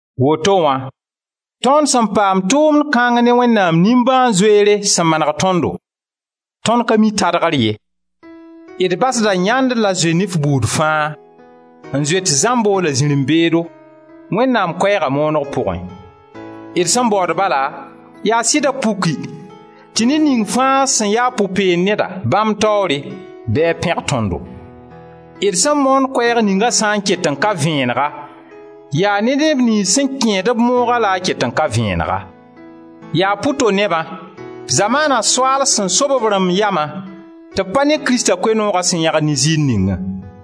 Woto wã, tõnd sẽn paam tʋʋmd kãng ne Wẽnnaam nimbãan-zoeere sẽn maneg tõndo, tõnd ka mi tadgr ye. D basda yãnd la zoe-nif buud fãa, n zoet zãmbo la zirẽ-beedo, Wẽnnaam Koɛɛgã mooneg pʋgẽ. D sẽn baood bala, yaa sɩda puki tɩ ned ning fãa sẽn yaa pʋ-peen-neda bãmb taoore bɩ a pẽg tõndo. D sẽn moond Koɛɛg ninga sã n ket n ka vẽenega, yaa ne neb niyns sẽn kẽed-b moogã la a ka vẽenega. Yaa pʋ-to-nebã: zamaana soaal sẽn sob b rãmb yama tɩ b pa ne Krista Koe-nooga sẽn yãgd ne ziir ningã.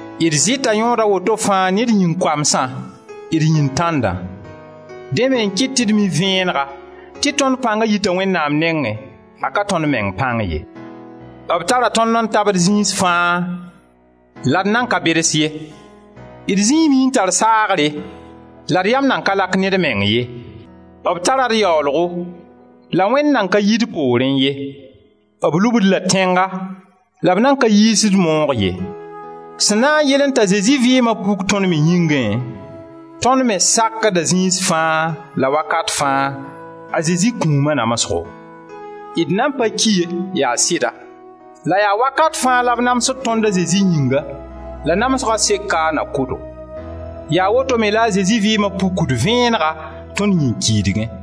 D zɩta yõod a woto fãa ne d yĩn-koamsã, d yĩn-tãndã. Dẽ me n kɩt tɩ d mi vẽenega tɩ tõnd pãnga yita Wẽnnaam nengẽ, a ka tõnd meng pãng ye. B tara tõnd n tabd zĩis fãa la d nan ka beds ye. D zĩime n tar saagre la d yam nan ka lak ne d meng ye. B tara d yaoolgo la Wẽnd nan ka yi d poorẽ ye. B lub-d la tẽnga la b nan ka yiis-d moog ye. Sẽn na n yɩlẽ t'a Zezi vɩɩma puk tõnd me yĩngẽ, tõnd me sakda zĩis fãa la wakat fãa a Zezi kũuma namsgo. D nan pa ki ye, yaa sɩda, la yaa wakat fãa la b namsd tõnd a Zezi yĩnga la namsga seka a na kʋ-do. Yaa woto me la a Zezi vɩɩma pukd vẽenega tõnd yĩn-kiidgẽ.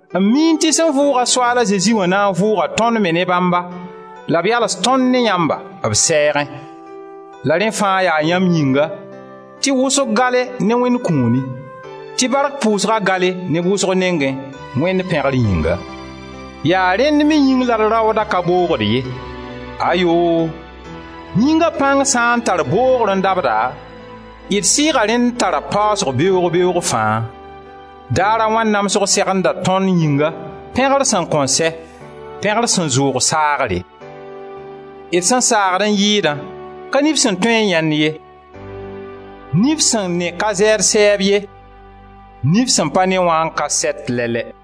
n miẽ tɩ sẽn vʋʋga Soaal a Zezi wã na n vʋʋga tõnd me ne bãmba la b yals tõnd ne yãmba b sɛɛgẽ. La rẽ fãa yaa yãmb yĩnga, tɩ wʋsg gale ne Wẽnd kũuni, tɩ bark pʋʋsga gale neb wʋsg nengẽ, Wẽnd pẽgr yĩnga. Yaa rẽnd me yĩng la d raooda ka boogd ye. Ayoo! Yĩnga pãng sã n tar boogre n dabda, d sɩɩga rẽnd tara paasg beoog-beoog fãa. Daar a wãn namsg segenda tõnd yĩnga, pẽgr sẽn kõn sɛ, pẽgr sẽn zʋʋg saagre. D sẽn saagd n yɩɩdã, ka nif sẽn tõe n yãend ye. Nif sẽn ne ka zɛɛd sɛɛb ye. Nif sẽn pa ne wã n ka sɛt lɛ-lɛ.